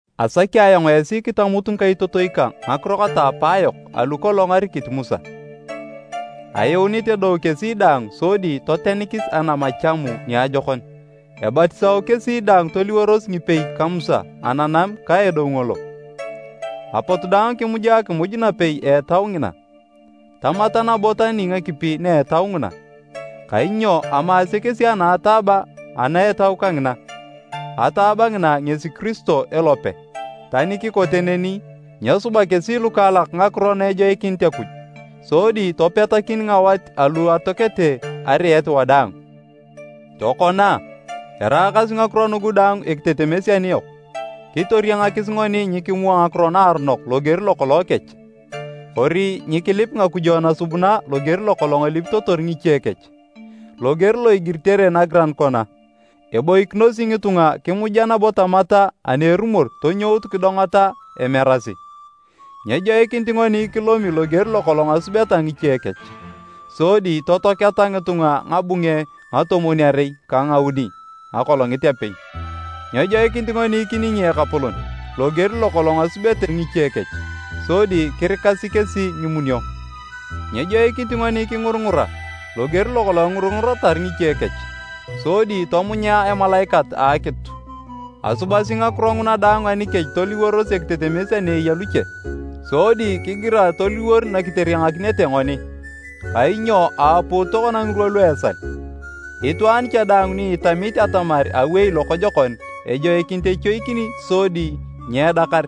Asaki ayong esi kitamut ngikaitotoi kang ngakiro kata apaayok alu kolong arikit Musa. Ayuunit edou kesi daang sodi totenikis anam a Chamu niajokon. Ebatisao kesi daang toliworos ngipei ka Musa ananam ka edou ngolo. Apot daang kimuja akimuj napei a etau ngina. Tamata nabo tani ngakipi na etau nguna, kainyo amaase kesi anataaba ana etau kangina, ataaba ngina ngesi Kiristo elope. Tani kikote neni, nyesuba kesi lukaalak ngakiro na ejoikinito Akuj, sodi topetakin ngawat alu atoakete ariet wadaang. Tokona, eraakasi ngakiro nugu daang ekitetemes aniyok, kitoriangakis ngoni nyikimua ngakiro naaronok loger lokolong kech, kori nyikilip ngakujo nasubuna loger lokolong elipitotor ngiche kech. Loger lo igiritere nagiran kona, “Eboikinosi ngitunga kimuja nabo tamata ani erumor tonyout kidongata emerasi.” Nyejoikinit ngoni kilomi, loger lokolong asubete ngiche kech, sodi totoaketa ngitunga ngabunge ngatomwon-arei ka ngauni akolongit apei. Nyejoikinit ngoni kiningi Ekapolon, loger lokolong asubete ngiche kech, sodi kirikasi kesi ngimunio. Nyejoikinit ngoni kingurungura, loger lokolong engurunguratar ngiche kech, sodi tomunya Emalaikat a Akitu. Asubasi ngakiro nguna daang anikech toliworos ekitetemes ani eya luche, sodi kigirae toliwor nakiteriangakinete ngoni, kainyo aaput tokona ngirwa lu esal. Itwaan cha daang ni itamit atamar awei lokojokon, ejoikinit echoikin sodi nyeedakar.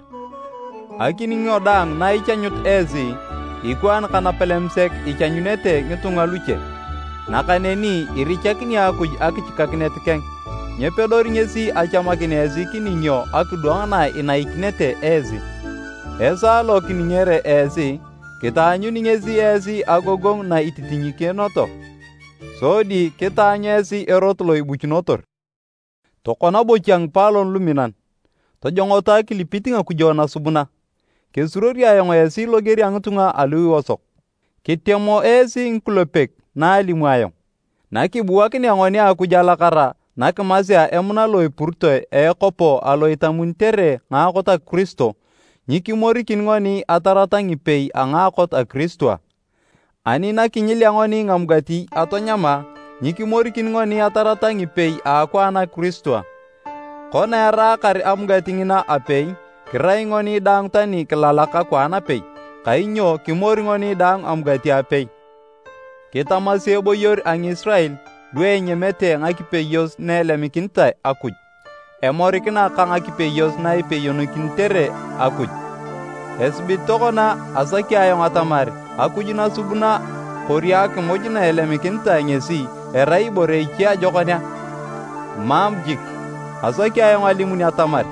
Akiningo daang na ichanyut esi, ikwaan ka napalem sek ichanyunete ngitunga luche. Nakaneni irichakini Akuj akichikakinet keng, nyepedori ngesi achamakin esi kiningio akidwang na inaikinete esi. Esaa lo kiningere esi, kitaanyuni ngesi esi agogongu na ititinyikinioto, sodi kitaanyu esi erot lo ibuchunotor. Tokona bocha ngipaalon luminan, tojongoto akilipit ngakujo nasubuna. Kesuruori ayong esi loger a ngitunga alu iosok, kitemo esi ngikulepek na alimu ayong. Nakibuakinea ngoni Akuj alakara na kimasea emuna lo epuritoe a ekopo alo itamunitere ngaakot a Kiristo, nyikimorikin ngoni atarata ngipei a ngaakot a Kiristo a? Ani nakinyilea ngoni ngamugati, atanyama, nyikimorikin ngoni atarata ngipei a akwaan a Kiristo a? Kona eraakar amugati ngina apei, kirai ngoni daang tani kilalak akwaan apei, kainyo kimori ngoni daang amugati apei. Kitamasi eboyor a Ngisirael, lu enyamete ngakipeyos na elemikinitae Akuj, emorikina ka ngakipeyos na ipeyokinitere Akuj. Esibit tokona asaki ayong atamar akuj nasubuna kori akimuj na elemikinitae ngesi, erai ibore iche ajokon a? Mam jik! Asaki ayong alimun atamar,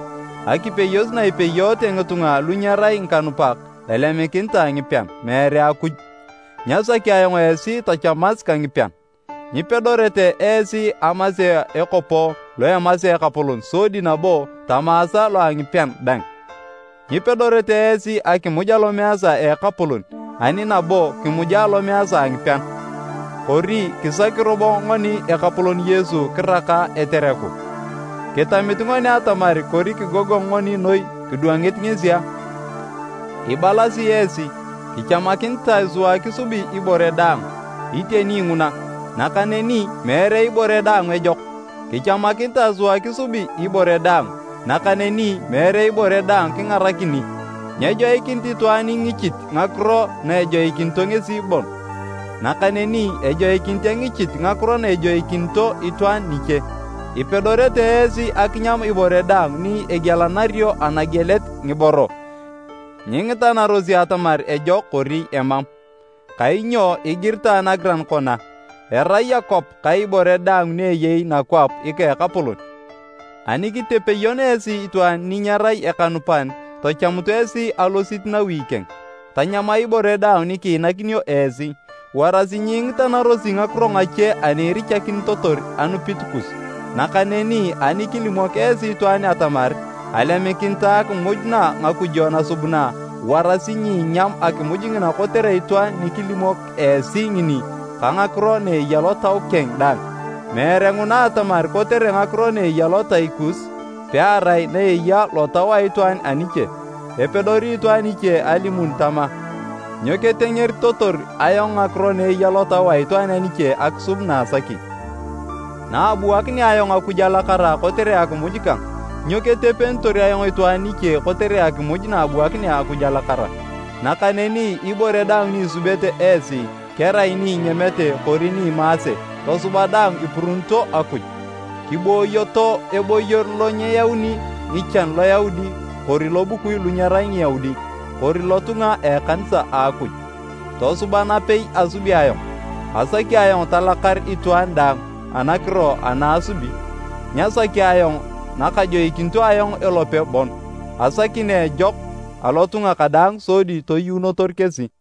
akipeyos na ipeyoete ngitunga lu nyerai ngikanupak, elemikinitae ngipean, meere Akuj. Nyasaki ayong esi tochamas ka ngipean. Nyipedorete esi amasea ekopo lo emasea Ekapolon sodi nabo tamaasa lo a ngipean dang, nyipedorete esi akimuj Alomeesa a Ekapolon ani nabo kimuja alomeesa a ngipean. Kori kisaki robo ngoni Ekapolon Yesu kiraka etereku? Kitamit ngoni atamar kori kigogong ngoni noi kidwangit ngesi a? Ibalasi esi, “Kichamakinitae sua kisubi ibore daang.” Iteni nguna, nakaneni meere ibore daang ejok. “Kichamakinitae sua kisubi ibore daang”, nakaneni meere ibore daang kingarakini. Nyejoikinit itwaan engichit ngakiro na ejoikinito ngesi bon, nakaneni ejoikinit engichit ngakiro na ejoikinito itwaan niche. Ipedorete esi akinyam ibore daang ni egielanario anagielet ngiboro, nyingitanarosi atamar ejok kori emam. Kainyo igiritae nagiran kona, “Erai akwap ka ibore daang ni eyei nakwap ika a Ekapolon.” Ani kitepeyon esi itwaan ni nyerai ekanupan tochamut esi alosit nawi keng, tanyama ibore daang ni kiinakinio esi, warasi nyingitanarosi ngakiro ngache ani irichakinitotor anupit kus. Nakaneni ani kilimok esi itwaan atamar, “Alemikinitae akimuj na ngakujo nasubuna,” warasi nyiinyam akimuj ngina kotere itwaan ni kilimok esi ngini ka ngakiro na eya lotau keng dang, meere nguna atamar kotere ngakiro na eya lotai kus, pearai na eya lotau a itwaan aniche. Epedori itwaan iche alimun tama, “Nyo ketengeritotor ayong ngakiro na eya lotau a itwaan aniche akisub naasaki? Naabuakinea ayong Akuj alakara kotere akimuj kang, nyo ketepenitor ayong itwaan niche kotere akimuj naabuakinea Akuj alakara?” Nakaneni ibore daang ni isubete esi, kerai ni inyamete kori ni imaase, tosuba daang ipuruunito Akuj. Kiboyoto eboyor lo nyeyauni ngichan Loyaudi kori lobukui lu nyerai Ngiyaudi kori lotunga a ekanisa a Akuj. Tosuba napei asubi ayong, asaki ayong talakar itwaan daang anakiro ana asubi, nyasaki ayong nakajoikinito ayong elope bon, asaki na ejok alotunga kadaang sodi toyuunotor kesi.